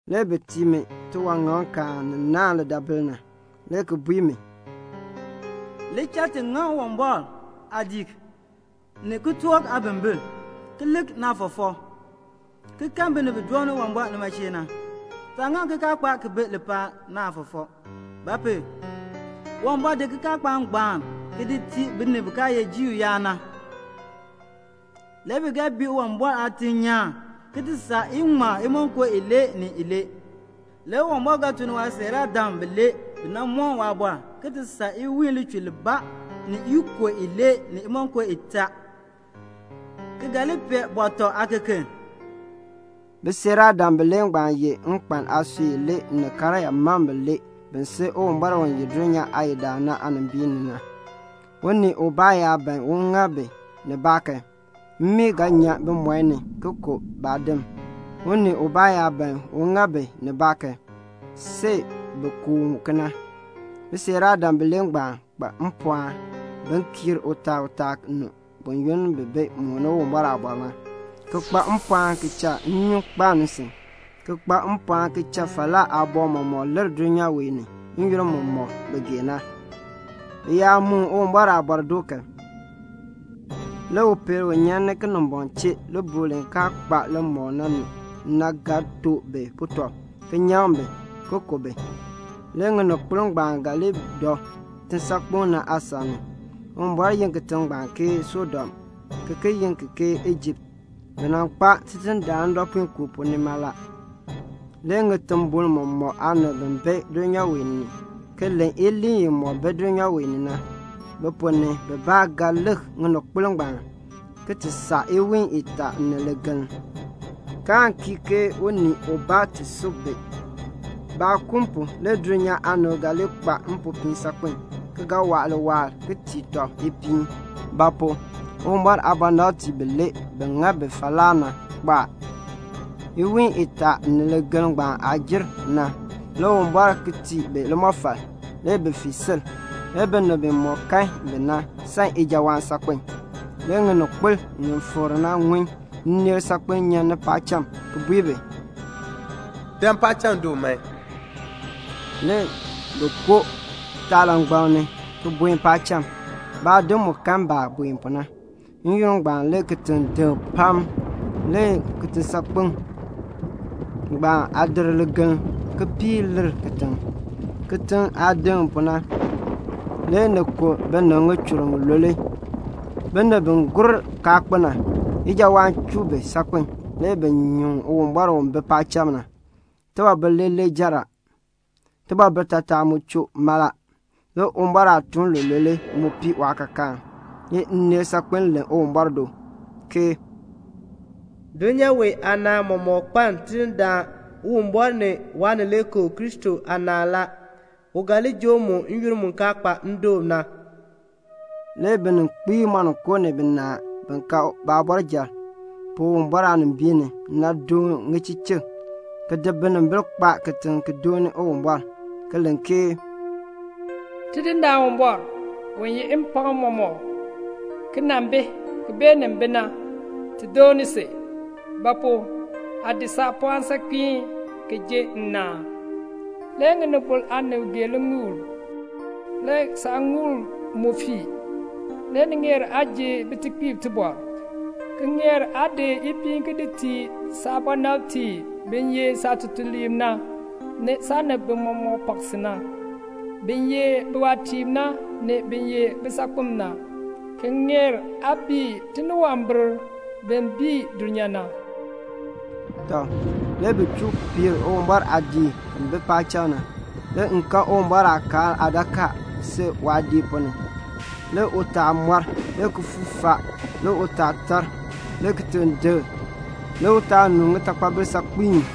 Le bi tii mi tiwaŋaŋkaan ni naahn lidaabil na, le ki bui mi, "Li cha ti ŋaŋ Uwumbɔr aadiik, ni kitork aabimbiln, ki lik naafɔfɔk, ki kahn binib bi dooni Uwumbɔr nima chee na. Taa ŋaŋ kikaakpaak ki bi lipaal na aafɔfɔk; ba pu? Uwumbɔr di kikaakpaak ngbaan ki di tii binib bi kaa ye Juu yaab na. Le bi ga bii Uwumbɔr aatiŋ nyaan iŋmal imonko ilee ni ilee. Le Uwumbɔr ga tun ni waasiiraadam bilee bi nan moon waaliin iwiin lichur libaa ni ikub ilee ni imonko itaa, ki ga li pee bɔtɔ aakeken." Bisiiraadam bilee ngbaan ye nkpan aasui ilee ni karyaa mam bilee bi si Uwumbɔr u ye dulnyaa Aadindaan na aanimbiin ni na. Unii ubaa yaa ban un ŋa bi nibaa kan, mmii ga nyan bimɔi ni ki ku baadim. Unii ubaa yaa ban un ŋa bi nibaa kan, see bi ku u kena. Bisiiraadam bilee ngbaan kpa mpɔɔn bin kiir utaal u taa nu buyoonn bi mooni Uwumbɔr aaliin na, ki kpa mpɔɔn ki cha nnyun kpaln nsin, ki kpa mpɔɔn ki cha falaa aaboŋ mɔmɔk lir dulnyaa wee ni n-yoonn mumɔk bi gee na. Bi yaa moon Uwumbɔr aaliin doo kan, le upeel u nyan Kinimbɔŋ chee libuul li kaa kpa limɔk na ni na ga to bi butɔb ki nyaŋ bi, ki ku bi. Le ŋininkpol ngbaan ga li dɔ kitisaakpeŋ na aasan ni. Uwumbɔr yi kitiŋ ngbaan Sodom, ki ki yi ki ke Ijipt. Bi nan kpaa Tidindaan ndɔpuinkoo pu nima la. Le ŋitimbol mɔmɔk aanib bi bi dulnyaa wee ni ki len iliin imɔk bi dulnyaa wee ni na, bi ponn ni bibaa ga lik ŋininkpol ngbaan iwiin itaa ni ligeln, kaan kii unii ubaa ti sub bi. Baakun pu le dulnyaa aanib ga li kpa mpopiin saakpen, ki waa liwaal, ki tii tɔb ipiin; ba pu? Uwumbɔr aabɔnabtiib bilee bi ŋa bi falaa na kpo a. Iwiin itaa ni ligeln ngbaan aah jer na, le Uwumbɔr ki tii bi limɔfal. Le bi fii sil. Le binib bimɔk kan bi na san ijawaan saakpen. Le ŋininkpol ŋi fikr na ŋun nneel saakpiin nyan ni paacham ki bui bi, "Dan paacham du man." Le bi koo kitaalangbaŋ ni ki buen paacham. Baadim mu kan baah buen pu na. N-yoonn ngbaan le kitiŋ deŋ pam. Le kitisaakpeŋ ngbaan aadir ligeln kipiik lir kitiŋ. Kitiŋ aah deŋ pu na le ni ku binib ŋichur ŋilule. Binib bi gur kaa kpo na, ijawaan chuu bi saakpen, le bi nyuŋ Uwumbɔr u bi paacham na. Tibɔbil leeler jer a. Tibɔbil taatar mu choo mala. Le Uwumbɔr aatuun lulule mu pii waakaakaan. Le ineel saakpiin len Uwumbɔr do ke "Dulnyaa wee aanaan mɔmɔk kpaln Tidindaan Uwumbɔr ni Waanileekoo Kristo aanaan la. U ga li joo mu n-yoonn mu kaa kpa ndoon na." Le bininkpiib moninko ni binaa bi ka baabɔrjal pu Uwumbɔr aanimbiin ni na doon ŋichichik ki di binimbil kpaa kitiŋ ki dooni Uwumbɔr, ki len ke "Tidindaan Uwumbɔr, u yeh mpɔɔn mɔmɔk, ki nan bi, ki beenin bi na, ti dooni si; ba pu? aa di saapɔɔn saakpiin ki jin nnaan. Le ŋinibol aanib gee liŋuul. Le saaŋuul mu fii. Le ni ŋeer aa ji bitekpiib tibɔr, ki ŋeer aa di ipiin ki di tii saabɔnabtiib bi ye saatutuliib na, ni saanib mɔmɔk bi pak si na, bin ye biwaatiib na, ni bin ye bisaakpem na, ki ŋeer aa bii tiniwambir bin bii dulnyaa na." Tɔ, le bi chuu piir Uwumbɔr aadiik ki bi paacham na. Le m kan Uwumbɔr aakaal aadakaa si waadiik ponn ni. Le utaal moor, le kifuuk faa, le utaal tar, le kitiŋ deŋ, le utaal nu ŋitaatakpabil saakpiin.